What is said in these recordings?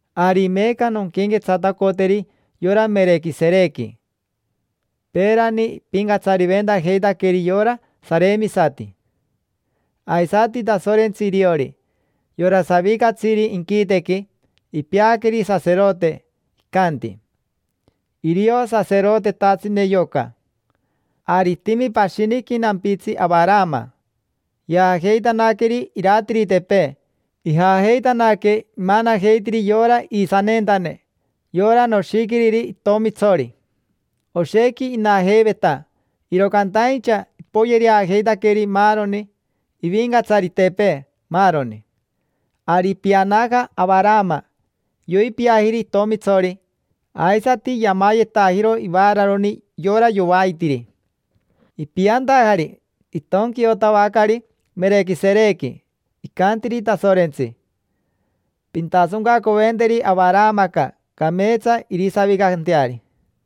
Ari meeca nonquenquetsatacoteri yora Merequiserequi: peerani ipincatsariventajeitaqueri yora saremisati. Aisati Tasorentsi iriori, yora savicatsiri inquitequi, ipeaqueri saserote, icanti: “Irio saserotetatsine yoca”. Ari itimi pashiniqui nampitsi Avarama. Yaajeitanaqueri iratiritepee, ijajeitanaque imanajeitiri yora iisaneentane, yora noshiquiriri itomitsori: oshequi inajeiveta, iro cantaincha ipoyereajeitaqueri maaroni, ivincatsaritepee, maaroni. Ari ipianaja Avarama, yoipiajiri itomitsori, aisati yamayetajiro ivararoni yora yovaitiri. Ipiantajari, itonquiotavacari Merequiserequi, icantiri Tasorentsi: “Pintasoncacoventeri Avaramaca cameetsa irisavicanteari”.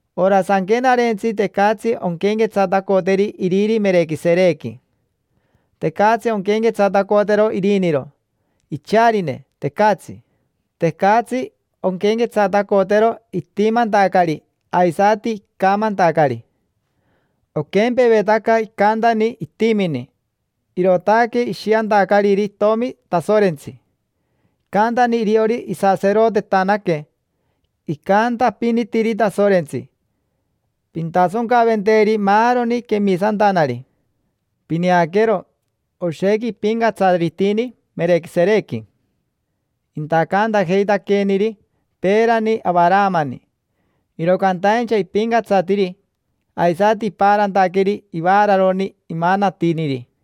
Ora sanquenarentsi tecatsi onquenquetsatacoteri iriri Merequiserequi. Tecatsi onquenquetsatacotero iriniro, icharine, tecatsi. Tecatsi onquenquetsatacotero itimantacari aisati icamantacari. Oquempevetaca icantani itimini, irootaque ishiantacariri itomi Tasorentsi; icantani iriori isaserotetanaque, icantapinitiri Tasorentsi: “Pintasoncaventeri maaroni quemisantanari”. Pineaquero, oshequi ipincatsaritini Merequiserequi. Intacantajeitaqueeniri peerani Avaramani, iro cantaincha ipincatsatiri, aisati ipaarantaqueri ivaararoni imanatiniri.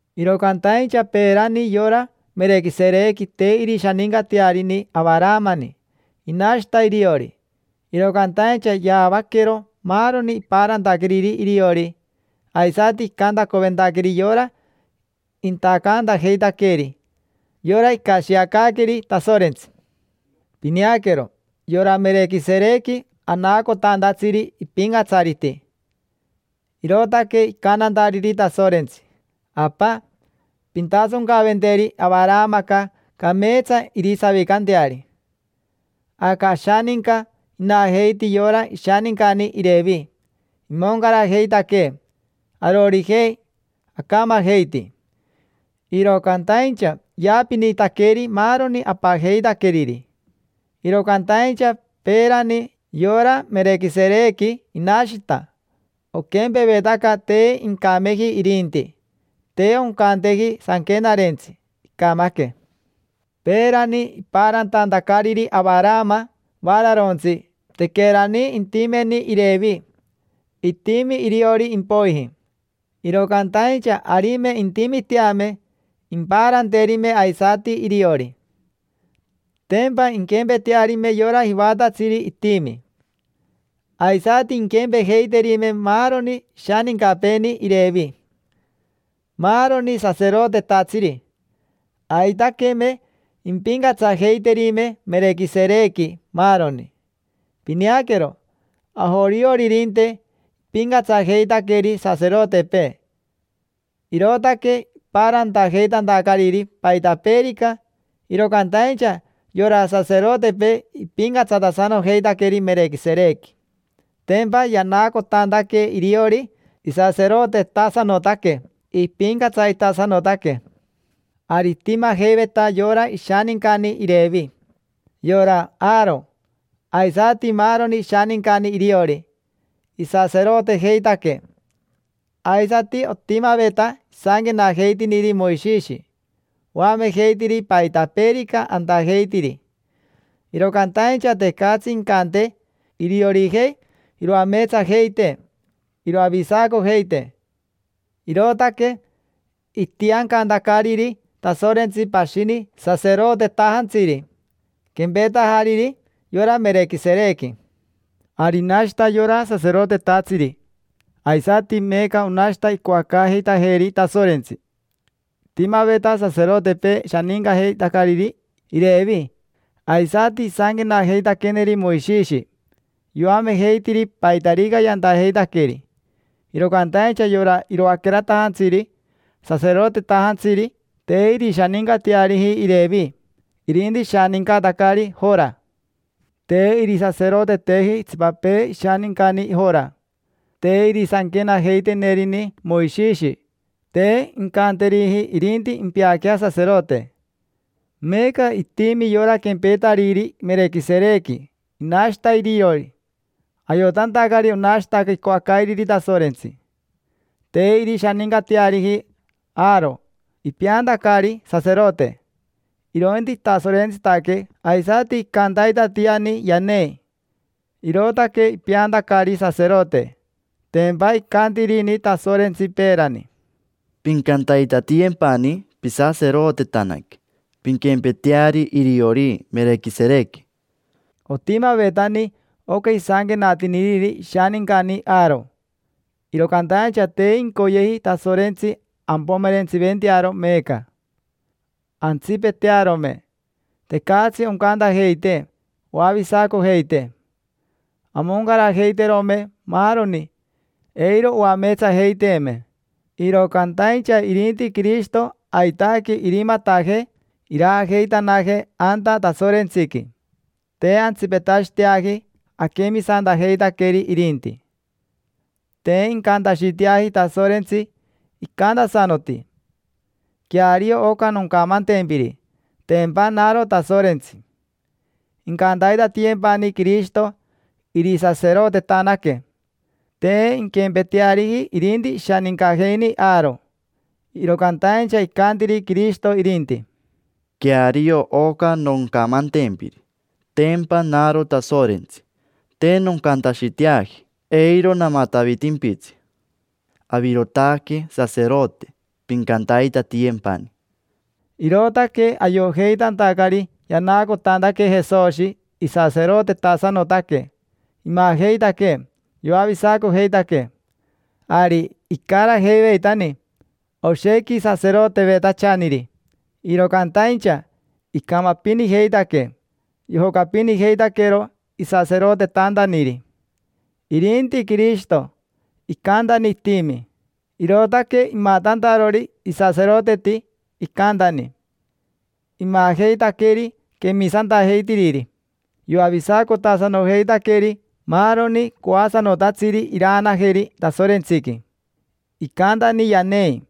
Iro cantaincha peerani yora Merequiserequi te irishanincatearini Avaramani, inashita iriori; iro cantaincha yaavaquero maaroni ipaarantaqueriri iriori, aisati icantacoventaqueri yora intacantajeitaqueeri: yora icashiacaaqueri Tasorentsi. Pineaquero, yora Merequiserequi anaacotantatsiri ipincatsariti, irootaque icantantariri Tasorentsi: “Apa, pintasoncacoventeri Avaramaca cameetsa irisavicanteari”. Aca ashaninca inajeiti yora ishanincani Irevi, imoncarajeitaquee arorijei, acamajeiti, iro cantaincha yaapinitaqueri maaroni apajeitaqueriri. Iro cantaincha peerani yora Merequiserequi, inashita: oquempevetaca te incameji irinti, te oncanteji sanquenarentsi: “Icamaque”. Peerani, ipaarantantacariri Avarama vaararontsi, tequerani intimeni Irevi: itimi iriori impoiji. Iro cantaincha arime intimiteame, impaaranterime aisati iriori: tempa inquempetearime yora jivatatsiri itimi. Aisati inquempejeiterime maaroni ishanincapeeni Irevi: maaroni saserotetatsiri. Aitaqueme impincatsajeiterime Merequiserequi maaroni. Pineaquero, ajorioririnte ipincatsajeitaqueri saserotepee, irootaque ipaarantajeitantacariri paitapeerica, iro cantaincha yora saserotepee ipincatsatasanojeitaqueri Merequiserequi: tempa yanaacotantaque iriori isaserotetasanotaque, ipincatsaritasanotaque. Ari itimajeiveta yora ishanincani Irevi: yora Aaro aisati maaroni ishanincani iriori, isaserotejeitaque; aisati otimaveta isanquenajeitiniri Moishishi, oamejeitiri paitapeerica antajeitiri. Iro cantaincha tecatsi incantee iriorijei iroameetsajeitee, iroavisacojeitee; irootaque itiancantacariri Tasorentsi pashini saserotetajantsiri, quempetajariri yora Merequiserequi. Ari inashita yora saserotetatsiri, aisati meeca onashita icoacaajeitajeeri Tasorentsi. Itimaveta saserotepee shanincajeitacariri Irevi, aisati isanquenajeitaqueneri Moishishi, yoamejeitiri paitarica yantajeitaqueri. Iro cantaincha yora iroaqueratajantsiri saserotetajantsiri te irishanincateariji Irevi, irinti ishanincatacari Jora. Te irisaseroteteji itsipapee ishanincani Jora: te irisanquenajeitenerini Moishishi, te incanteriji irinti impeaquea saserote. Meeca itimi yora quempetariri Merequiserequi, inashita iriori, ayotantacari onashita icoacairiri Tasorentsi. Te irishanincateariji Aaro ipeantacari saserote; irointi itasorentsitaque aisati icantaitatiani yanei, irootaque ipeantacari saserote. Tempa icantirini Tasorentsi peerani: “Pincantaitatiyempani pisaserotetanaque, pinquempeteari iriori Merequiserequi”. Otimavetani oca isanquenatiniriri ishanincani Aaro, iro cantaincha te incoyeji Tasorentsi ampomerentsiventearo meeca. Antsipetearome, tecatsi oncantajeitee oavisacojeitee. Amoncarajeiterome maaroni, eiro oameetsajeiteeme. Iro cantaincha irinti Quirishito aitaque irimatajee iraajeitanajee anta Tasorentsiqui. Te antsipetashiteaji aquemisantajeitaqueri irinti. Te incantashiteaji Tasorentsi, icantasanoti: “Queario oca noncamantempiri, tempa naro Tasorentsi. Incantaitatiyempani Quirishito irisaserotetanaque”. Te inquempeteariji irinti ishanincajeini Aaro. Iro cantaincha icantiri Quirishito irinti: “Queario oca noncamantempiri, tempa naro Tasorentsi. Te noncantashiteaji, eiro namatavitimpitsi. Avirotaque saserote, pincantaitatiyempani”. Irootaque ayojeitantacari yanaacotantaque Jesoshi isaserotetasanotaque, imajeitaquee yoavisacojeitaquee. Ari icarajeiveitani oshequi saserotevetachaniri, iro cantaincha icamapinijeitaque, yojocapinijeitaquero isaserotetantaniri. Irinti Quirishito, icantani itimi: irootaque imatantarori isaseroteti, icantani. Imajeitaqueri quemisantajeitiriri: yoavisacotasanojeitaqueri maaroni coasanotatsiri iraanajeri Tasorentsiqui. Icantani yanei,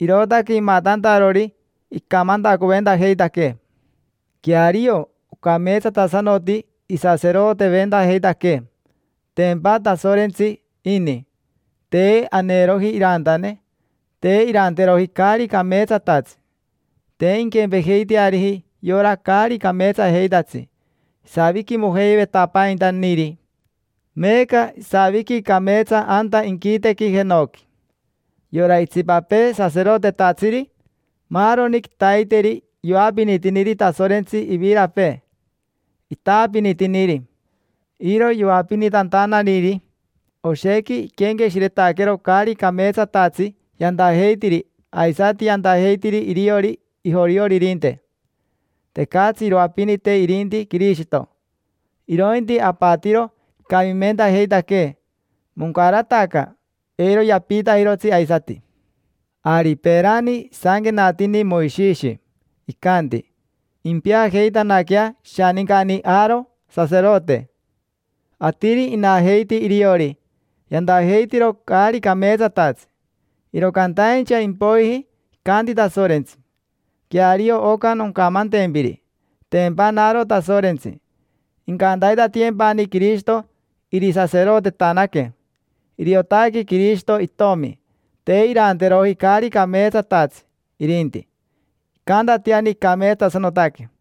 irootaque imatantarori icamantacoventajeitaquee. Queario, ocameetsatasanoti isaseroteventajeitaquee; tempa Tasorentsi ini, te aneroji irantane, te iranteroji caari cameetsatatsi; te inquempejeiteariji yora caari cameetsajeitatsi isaviquimojeivetapaintaniri. Meeca isaviqui cameetsa anta inquitequi jenoqui. Yora itsipapee saserotetatsiri, maaroni quitaiteri yoapinitiniri Tasorentsi ivirapee, itaapinitiniri. Iro yoapinitantanariri, oshequi iquenqueshiretaquero caari cameetsatatsi yantajeitiri aisati yantajeitiri iriori ijorioririnte. Tecatsi iroapinite irinti Quirishito, irointi apatiro icamimentajeitaquee: moncarataca, eiro yapiitajirotsi aisati. Ari peerani isanquenatini Moishishi, icanti: “Impeajeitanaquea ishanincani Aaro saserote”. Atiri inajeiti iriori, yantajeitiro caari cameetsatatsi. Iro cantaincha impoiji icanti Tasorentsi: “Queario oca noncamantempiri, tempa naro Tasorentsi: incantaitatiyempani Quirishito irisaserotetanaque”. Iriotaque Quirishito Itomi, te iranteroji caari cameetsatatsi irinti, icantatiani icameetsatasanotaque.